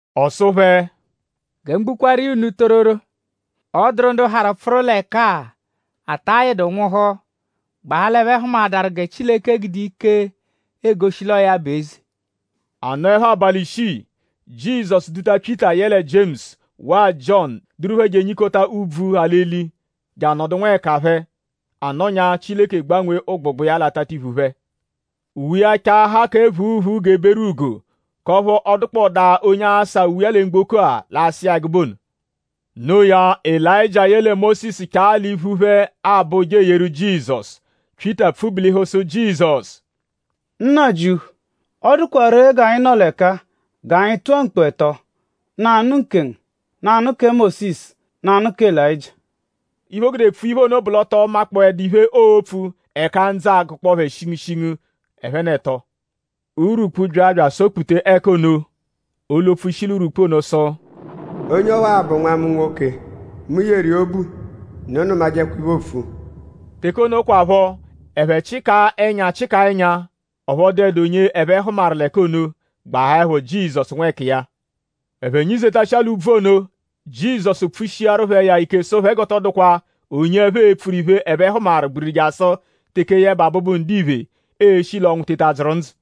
Ọ sụ phẹ: “Gẹ mu gbukwaaru iya unu tororo; ọ dụru ndu harụ pfụru l'ẹka-a, ata yịdu nwụhu; gbahaa l'ẹphe hụmaadaru gẹ Chileke gude ike egoshi l'ọo ya bụ eze.” A nọepho abalị ishii; Jizọsu duta Pyịta yẹle Jiemusu waa Jiọnu duru phẹ je enyikota úbvú, ha l'eli; je anọdu nwẹkinyi phẹ. A nọnyaa; Chileke gbanwee ụgbugba iya l'atatiphu phẹ. Uwe iya chaahaa kẹ phuuphuu g'eberugo; k'ọphu ọ dụkpodaa onye asa uwe lẹ mgboko-a, l'asa iya ẹgube ono. Noo ya; Elayịjia yẹle Mósisu chaa l'iphu phẹ abọ ụja eyeru Jizọsu. Pyịta pfubulihu sụ Jizọsu: “Nnajịuphu; ọ dụkwa ree g'anyi nọ l'ẹka-a; g'anyi tụa mkpu ẹto: nanụ nkengu; nanụ kẹ Mósisu; nanụ kẹ Elayịjia.” Iphe, o gude pfua iphe ono bụ l'ọ tọ makpọdaa iphe, oopfu; ẹka ndzụ agụkpoo phẹ shingushingu ẹphe n'ẹto. Urwukpu bya bya asọ-kputa ẹka ono; olu-opfu shi l'urwukpu ono sụ: “Onye ọwa-a bụ Nwa mu nwoke. Mu yeru iya obu. Unu nụmajekwa iphe, oopfu!” Teke ono kwaphọ; ẹphe chịkaa ẹnya chịkaa ẹnya; ọphu ọ dụedu onye ẹphe hụmaru l'ẹka ono; gbahaẹpho Jizọsu nwẹkiya. Ẹphe nyizetashịa l'úbvú ono; Jizọsu pfushiaru phẹ iya ike sụ phẹ g'ọ tọ dụkwa onye ẹphe e-pfuru iphe, ẹphe hụmaru gbiriri jasụ teke yẹbe Abụbu-Ndiphe e-shi l'ọnwu teta dzụru ndzụ.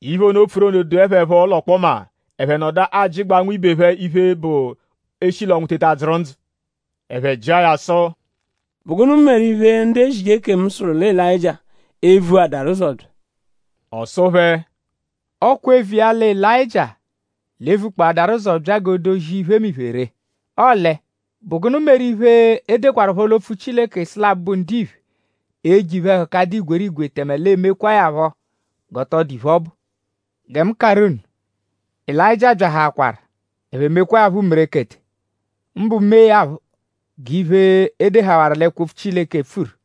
Iphe ono, o pfuru ono dụe phẹ phọ l'ọkpoma; ẹphe nọdu ajịgbaa nwibe phẹ iphe, bụ eshi l'ọnwu teta dzụru ndzụ. Ẹphe jịa ya sụ: “?Bụ gụnu meru iphe ndu ezije ekemu sụru lẹ Elayịjia e-vuadaru ụzo bya?” Ọ sụ phẹ: “Ọ kwa eviya lẹ Elayịjia l'e-vukpọadaru ụzo bya g'o dozia iphemiphe ree. Ọle?bụ gụnu meru iphe, e dekwaruphọ l'opfu Chileke sụ lẹ Abụbu-Ndiphe e-je iphe-ẹhuka, dụ igwerigwe; tẹme l'e mekwaa ya phọ g'ọ tọ dụdu iphe, ọ bụ? Gẹ mu karụ unu: Elayịjia byahaakwaru; ẹphe mewaa ya umerekete; mbụ meẹ ya phọ g'iphe, e dehawaru l'ẹkwo-opfu Chileke pfuru.”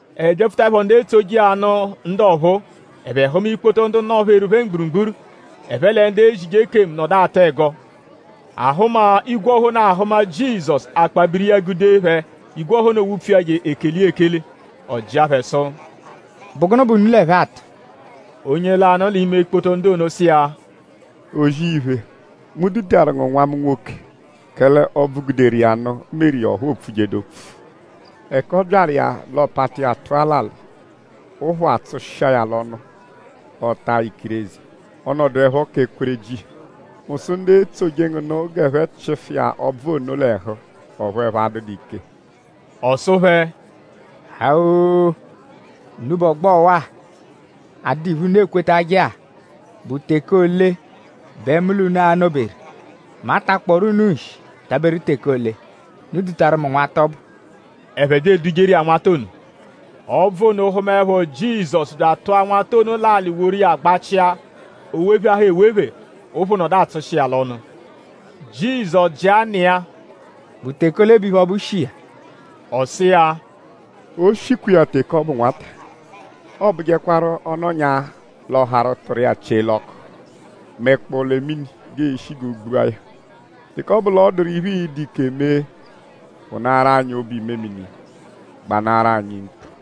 Ẹphe byapfutaẹpho ndu etsoje iya nụ ndu ọphuu; ẹphe hụma ikpoto ndu nọ-pheru phẹ mgburugburu. Ẹphe lẹ ndu ezije ekemu nọdu atụ ẹgo. Ahụma, igwe ọha ono ahụma Jizọsu; akpabiri iya gude phẹ. Igwe ọha ono wupfu iya je ekele iya ekele. Ọ jịa phẹ sụ: “?Bụ gụnu bẹ unu l'ẹphe atụ?” Onye lanụ l'ime ikpoto ndu ono sụ iya: “O-zì-iphe; mu dutaru ngu nwa mu nwoke; kẹle ọbvu, guderu iya nụ meru iya ọphu o pfujedu opfu. Ẹka ọ byaru iya l'ọ pata iya tụa l'alị; ụphu atsụshi iya l'ọnu; ọota ikireze; ọ nọduepho kẹ kwereji. Mu sụ ndu etsoje ngu nụ g'ẹphe chịfu iya ọbvu ono l'ẹhu; ọphu ẹphe adụdu ike.” Ọ sụ phẹ: “Ha-oo! Unubẹ ọgbo ọwa-a, adụdu iphe, unu ekwetajẹ-a.?Bụ teke ole bẹ mu l'unu a-nọ-beru??Mu a-takpọoru unu nshi taberu teke ole? Unu dutaru mu nwata ọbu!” Ẹphe bya edujeru iya nwata ono. “Ọbvu ono hụmaepho Jizọsu bya atụa nwata ono l'alị woru iya gbachịa. O wepheahaa ewephe; ụ́phù nọdu atsụshi iya l'ọnu. Jizọsu jịa nna iya:?Bụ teke ole bẹ iphe ọbu shi iya?” Ọ sụ iya: “O shikwa iya teke ọ bụ nwata.” “Ọobujekwaru ọ -nọnyaa; l'ọ harụ tụru iya chie l'ọku; mẹkpoo lẹ mini g'eeshi g'o gbua ya. Teke ọ bụ l'ọ dụru iphe, ịi-dụ ike mee; phụnaaru anyi obu-imemini; gbanaaru anyi mkpu!”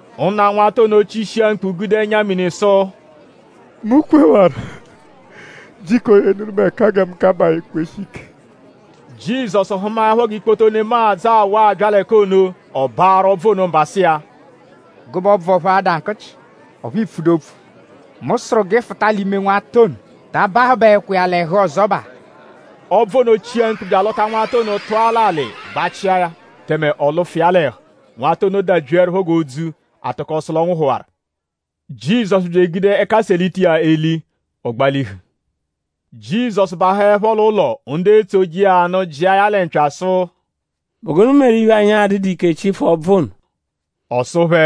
Nna nwata ono chishia mkpu gude ẹnya-mini sụ: “Mu kwewaru; jiko yenụru mu ẹka gẹ mu kabaa ekweshi ike!” Jizọsu hụmaepho g'ikpoto nemadzụ awụ abya l'ẹka ono; ọ baarụ ọbvu ono mba sụ iya: “Gụbe ọbvu ọphu ada nkụchi; ọphu iipfudu opfu; mu sụru g'ị fụta l'ime nwata ono. Ta abahụbaekwa iya l'ẹhu ọzobaa.” Ọbvu ono chia mkpu bya alọta nwata ono tụa l'alị; gbachia ya; tẹme ọ lụfu iya l'ẹhu. Nwata ono dabyiẹrupho g'odzu. A tụko sụ l'ọ nwụhuwaru. Jizọsu bya egude ẹka selita iya eli; ọ gbalihu. Jizọsu bahụepho l'ụlo; ndu etsoje iya nụ jịa ya lẹ mpya sụ: “?Bụ gụnu meru iphe, anyi adụdu ike chịfu ọbvu ono?” Ọ sụ phẹ: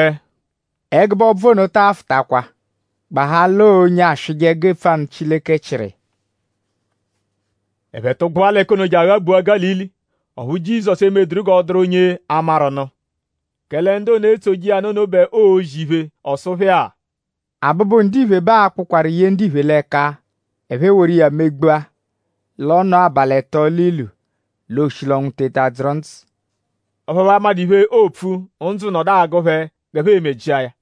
“Ẹgube ọbvu ono taa fụtakwa; gbahaa l'ọo onye aswịje ẹgu epfu anụ Chileke chịru iya.” Ẹphe tụgbua l'ẹka ono je aghabua Gálili; ọphu Jizọsu emeduru g'ọ dụru onye a-maru nụ; kẹle ndu ono, etsoje iya nụ ono bẹ oozi iphe. Ọ sụ phẹ-a: “Abụbu-Ndiphe bẹ aa-kpụkwaru ye ndiphe l'ẹka; ẹphe eworu iya megbua. L'ọ nọo abalị ẹto l'ilu; l'ooshi l'ọnwu teta dzụru ndzụ.” Ọphu ẹphe amadụ iphe, oopfu; ndzụ nọdu agụ phẹ g'ẹphe e-me jịa ya.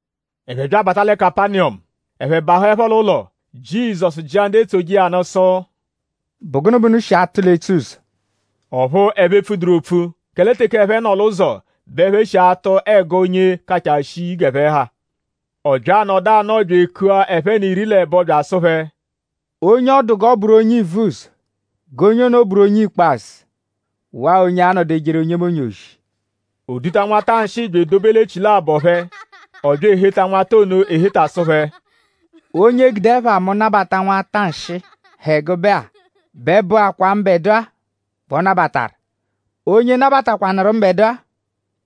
Ẹphe bya abata lẹ Kapaniyọmu. Ẹphe bahụepho l'ụlo; Jizọsu jịa ndu etsoje iya nụ sụ: “?Bụ gụnu bẹ unu shi atụ l'etsuzọ?” Ọphu ẹphe epfuduru opfu; kẹle teke ẹphe nọ l'ụzo bẹ ẹphe shi atụ ẹgo onye kachaa shii lẹ g'ẹphe ha. Ọ bya anọdu anọo bya ekua ẹphe n'iri l'ẹbo bya asụ phẹ: “Onye ọ dụ g'ọ bụru onye ivuzọ g'onye ono bụru onye ikpazụ waa onye a-nọdu ejeru onyemonye ozi.” O duta nwata nshịi bya edobe l'echilabọ phẹ. Ọ bya eheta nwata ono eheta sụ phẹ: “Onye gude ẹpha mu nabata nwata nshịi, ha ẹgube-a bẹ bụakwaa mbẹdua bẹ ọ nabataru. Onye nabatakwanụru mbẹdua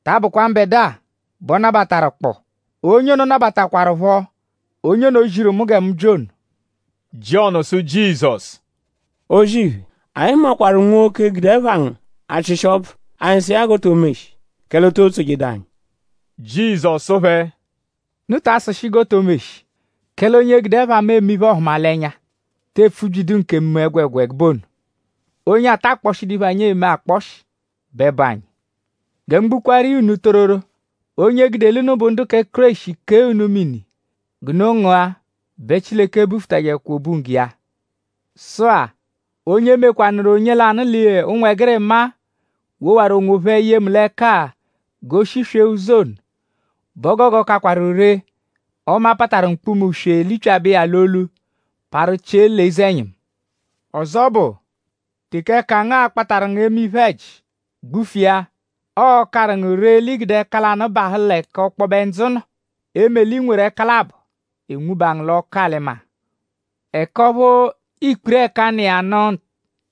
ta abụkwa mbẹdua bẹ ọ nabataru kpụ; onye ono nabataakwarụpho onye ono, ziru mu gẹ mu bya ono.” Jiọnu sụ Jizọsu: “O-zì-iphe; anyi hụmakwaru nwoke, gude ẹpha ngu achịshi ọbvu; anyi sụ iya g'o to meshi; kẹle o too tsojedu anyi.” Jizọsu sụ phẹ: “Unu ta asụshi g'o to meshi; kẹle onye gude ẹpha mu eme iphe-ọhumalenya te epfubyidu nkemu ẹgwegwa ẹgube ono. Onye ata akpọshidu iphe, anyi eme akpọshi bẹ bụ anyi. Gẹ mu gbukwaaru iya unu tororo; onye gude l'unu bụ ndu kẹ Kéreshi kee unu mini g'unu ngụa bẹ Chileke bufutajẹkwa obunggo iya.” “Sụ-a; onye mekwanụru onye lanụ l'ụnwegirima-a, wowaru onwophẹ ye mu l'ẹka-a g'o shiswee ụzo ono bẹ o gogo kakwaru ree ọme a pataru mkpuma-uswe; lipyabẹ iya l'olu; parụ chie l'eze-ẹnyimu. Ọzo bụ; teke ẹka ngu akpataru ngu eme iphe-ẹji; gbufu iya. Ọo-karụ ngu ree l'i gude ẹka lanụ bahụ l'ẹka ọkpobe ndzụ nọ; eme l'i nweru ẹka labọ; e nwuba ngu l'ọku-alị-maa. Ẹka ọphu ikpiri-ẹ̀kà, nọ iya nụ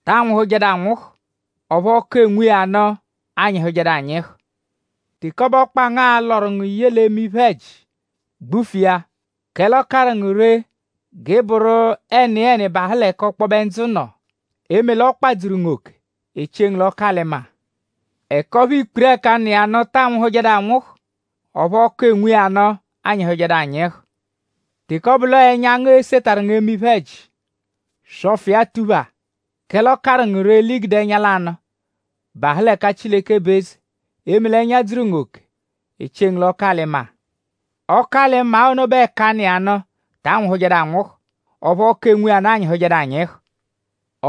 ta anwụhujedu anwụhu; ọphu ọku enwu iya nụ anyịhujedu anyịhu. Teke ọ bụ ọkpa ngu a-lọru ngu ye l'eme iphe-ẹji; gbufu iya. Kẹle ọ karụ ngu ree g'ị bụru ẹniyeni bahụ l'ẹka ọkpobe ndzụ nọ; eme l'ọkpa dzuru ngu oke; e chie ngu l'ọku-alị-maa. Ẹka ọphu ikpiri-ẹ̀kà, nọ iya nụ ta anwụhujedu anwụhu. Ọphu ọku, enwu iya nụ anyịhujedu anyịhu. Teke ọ bụ l'ọo ẹnya ngu esetaru ngu eme iphe-ẹji; swọfu iya tuphaa; kẹle ọo-karụ ngu ree l'i gude ẹnya lanụ bahụ l'ẹka Chileke bụ eze; eme l'ẹnya dzuru ngu oke; e chie ngu l'ọku-alị-maa. Ọku-alị-maa ono bẹ ẹ̀kà, nọ iya nụ ta anwụhujedu anwụhu; ọphu ọku, enwu iya nụ anyịhujedu anyịhu.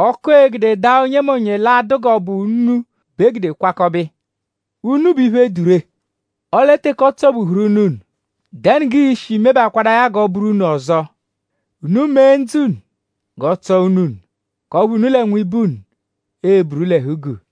“Ọku, ee-gude dàà onyemonye l'a-dụ g'ọ bụ únú bẹ e gude kwakọbe iya. Únú bụ iphe, dụ ree; ọle teke ọ tsọ-buhuru únú-únú;?dẹnu g'ii-shi mebakwadaa ya g'ọ bụru únú ọzo. Unu mee ndzụ unu g'ọ tsọ únú únú; k'ọphu unu lẹ nwibe unu eburu l'ẹhu-guu.”